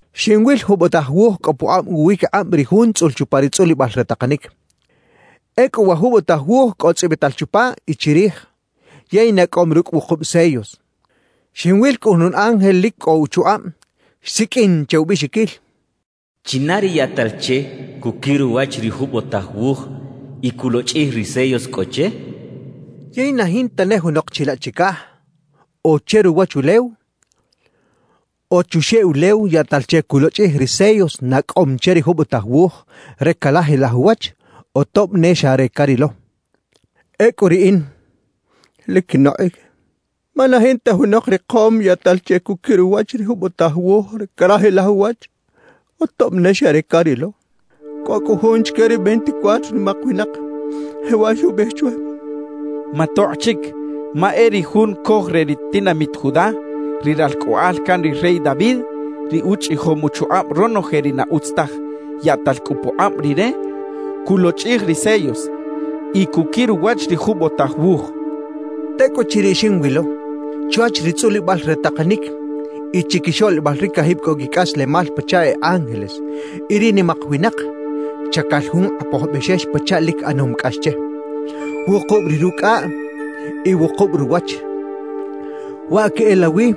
Xinwil jubotaj wuj cꞌo pukꞌab uwiquikꞌab ri Jun tzꞌul chupa ri tzꞌulibal re takanic. Ecꞌu wa jubotaj wuj cꞌo tzꞌibital chupa y chirij, yey nacꞌom rucꞌ wukub sellos. Xinwil cꞌu jun ángel lic cꞌo uchukꞌab xsiqꞌuin che ubiꞌxiquil: «¿China ri yaꞌtal che cuquir uwach ri jubotaj wuj y culochꞌij ri sellos cꞌo che?» xchaꞌ. Yey na jinta ne junok chilaꞌ chicaj o che ruwachulew o chuxeꞌ ulew yaꞌtal che culochꞌij ri sellos nacꞌom che ri jubotaj wuj re carajilaj uwach o tob ne xa re carilo. Ecꞌu riꞌin lic quinokꞌic, ma na jinta junok rikom yaꞌtal che cuquir uwach ri jubotaj wuj re carajilaj uwach o tob ne xa re carilo. Cꞌo cꞌu jun chique ri veinticuatro nimak winak, jewaꞌ xubiꞌij chwe: —Matokꞌ chic, ma e ri Jun Coj re ri tinamit Judá, ri ralcꞌoꞌal can ri rey David, ri uchꞌijom uchukꞌab ronoje ri na utz taj, yaꞌtal cꞌu pukꞌab Rire culochꞌij ri sellos y cuquir uwach ri jubotaj wuj —xchaꞌ. Tecꞌuchiriꞌ xinwilo, chwach ri tzꞌulibal re takanic y chiquixoꞌlibal ri cajib cꞌo quicꞌaslemal pachaꞌ e ángeles y ri nimak winak, chacal jun Kꞌapoj Bexex pachaꞌ lic ꞌanom cꞌax che. Wukub ri rucꞌaꞌ y wukub ruwach, waꞌ queꞌelawi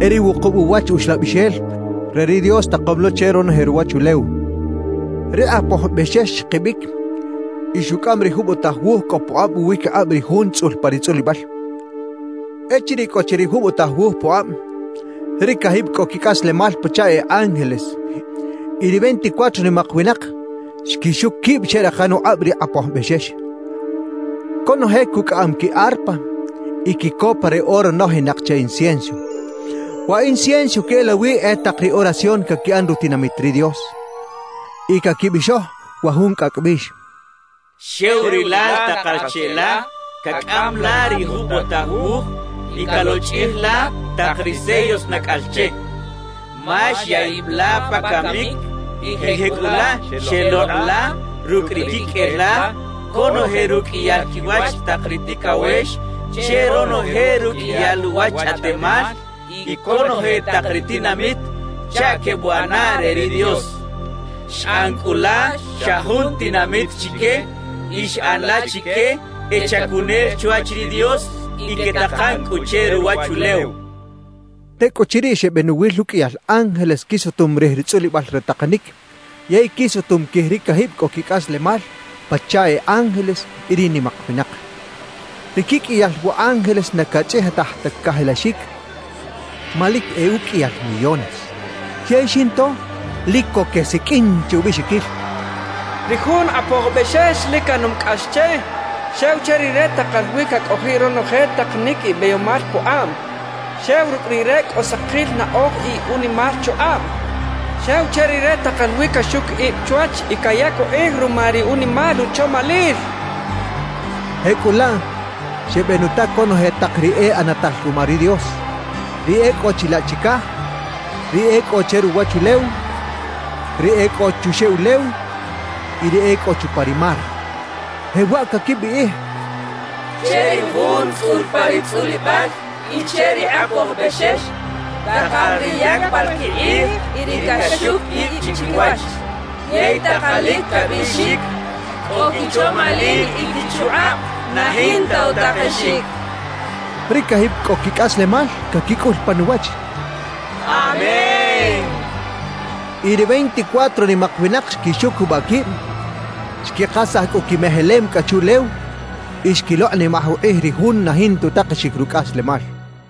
e ri wukub uwach Uxlabixel re ri Dios takom lo che ronoje ruwachulew. Ri Kꞌapoj Bexex xkibic y xucꞌam ri jubotaj wuj cꞌo pukꞌab uwiquikꞌab ri Jun tzꞌul pa ri tzꞌulibal. Echiriꞌ cꞌo chi ri jubotaj wuj pukꞌab, ri cajib cꞌo quicꞌaslemal pachaꞌ e ángeles y ri veinticuatro nimak winak xquixuc quib xeꞌrakan ukꞌab ri Kꞌapoj Bexex. Conoje cucꞌaꞌam qui arpa y quicopa re oro nojinak che incienso. Wa incienso queꞌelawi e tak ri oración caquiꞌan rutinamit ri Dios. Y caquibixoj wa jun cꞌacꞌ bix: «Xew Rilal takal cheꞌla cacꞌam la ri jubotaj wuj y calochꞌij la tak ri sellos nacꞌal che, ma xya ib la pa camic y jecꞌulaꞌ xelokꞌ la rucꞌ ri quiqꞌuel la conoje ruqꞌuiyal quiwach tak ri ticawex che ronoje ruqꞌuiyal uwach chꞌaꞌtemal y conoje tak ri tinamit chaꞌ quebuꞌana re ri Dios. Xꞌan cꞌu la xa jun tinamit chique y xꞌan la chique e chacunel chwach ri Dios y quetakan cꞌu che ruwachulew» quechaꞌ. Tecꞌuchiriꞌ xebenuwil uqꞌuiyal ángeles quisutum rij ri tzꞌulibal re takanic yey quisutum quij ri cajib cꞌo quicꞌaslemal pachaꞌ e ángeles y ri nimak winak. Ri quiqꞌuiyal wa ángeles na cachꞌijitaj ta cajilaxic ma lic e uqꞌuiyal millones. Yey xinto lic co quesiqꞌuin che ubiꞌxiquil: «Ri jun Kꞌapoj Bexex lic ꞌanom cꞌax che, xew che Rire takal wi cacꞌojiꞌ ronoje takanic y beyomal pukꞌab, xew rucꞌ Rire cꞌo sakil naꞌoj y unimal chukꞌab, xew che Rire takal wi caxuc ib chwach y cayac ukꞌij ruma ri unimal uchomalil» quechaꞌ. Jecꞌulaꞌ xebenuta conoje tak ri e ꞌanatal ruma ri Dios: ri e cꞌo chilaꞌ chicaj, ri e cꞌo che ruwachulew, ri e cꞌo chuxeꞌ ulew y ri e cꞌo chupa ri mar, jewaꞌ caquibiꞌij: «Che ri Jun tzꞌul pa ri tzꞌulibal y che ri Kꞌapoj Bexex, takal ri yacbal quikꞌij y ri caxuc ib chiquiwach yey takalic cabiꞌxic cꞌo quichomalil y quichukꞌab na jinta utakexic» quechaꞌ. Ri cajib cꞌo quicꞌaslemal caquicꞌul pan uwach: «¡Amén!» quechaꞌ. Y ri veinticuatro nimak winak xquixucubaꞌ quib, xquikasaj cꞌu quimejelem cꞌa chuꞌlew y xquilokꞌnimaj ukꞌij ri Jun na jinta utakexic rucꞌaslemal.